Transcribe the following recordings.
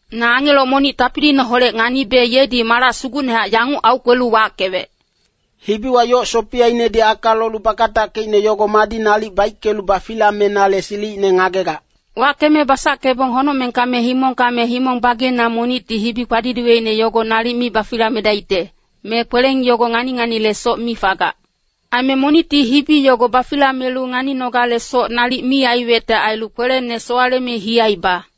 Na angelo monic tapiliineholec nganibe yedi malac sugucnehac yanguc aukwelu wackewec, “Hibiwa yoc sopiyainedi aka lolu bakatackeicne yogo madi nalic baickelu bafilamenale silicine ngagegac?” Wackeme basackebong honocmengka me himongka me himong bageina monicti hibi kpadidiweicne yogo nalic mi bafilamedaicte, me kweleng yogo ngani-nganilesoc mi fagac. Aime monicti hibi yogo bafilamelu nganinogalesoc nalic mi aiwecte ailu, kwelene sowaleme hiyaiba.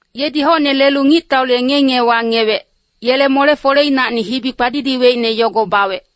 Yedi hocne lelu ngictaule ngiye-ngiyewa ngiyewec, yele mole-foleinacni hibi kpadidiweicne yogo bawec.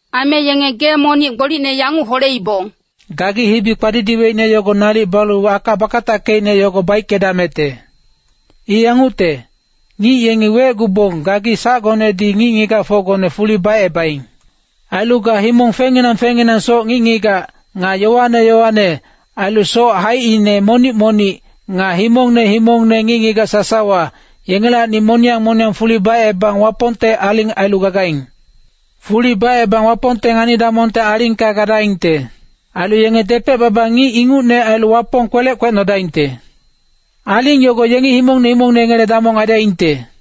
Aime yenge gee monic gbolicne yanguc holeibong. “Gagi hibi kpadidiweicne yogo nalic balu aka bakatackeicne yogo baickedamecte. I yangucte, ngic yengi wecgubong gagi sacgonedi ngic-ngigacfocgone fuli bacebaing. Ailu ga himong fengnginang fengnginangsoc ngic-ngigac, nga yowane yowane, ailu soc haicine monic-monic, nga himongne himongne ngic-ngigac sasawa, yengelacni moniyang moniyang fuli bacebang Wapongte aling ailu gagaing. Fuli bacebang Wapongte ngani-damongte alingka gadaingte. Ailu yenge depec-baba ngic ingucne ailu Wapong kwelec kwecnodaingte. Aling yogo yengi himongne himongne yengele damong aidaingte.”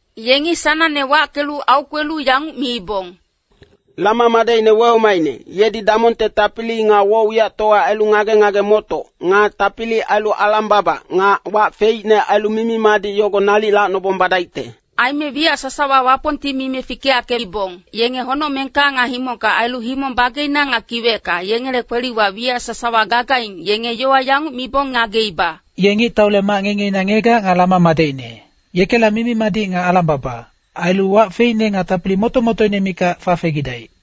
Yengi sanangne wackelu aukwelu yanguc miibong, “Lama madecine wehomaicne, Yedi damongte tapili nga woc-wiyactowa ailu ngage-ngage-motoc, nga tapili ailu alang-baba, nga wac feicne ailu mimi-madic yogo nalic lacnobong badaicte.” Aime wiyac sasawa Wapongti mime fikeyackeibong, yenge honocmengka nga himongka ailu himong bageina nga kiwecka, yengele kweliwa wiyac sasawa gagaing, yenge yowa yanguc mibong ngageiba. “Ye ngictaule mac ngiye-ngiyeina ngiyegac nga Lama madecine, Yekela mimi-madic nga alang-baba, ailu wac feicne nga tapili moto-motoine mikac fafegidaic.”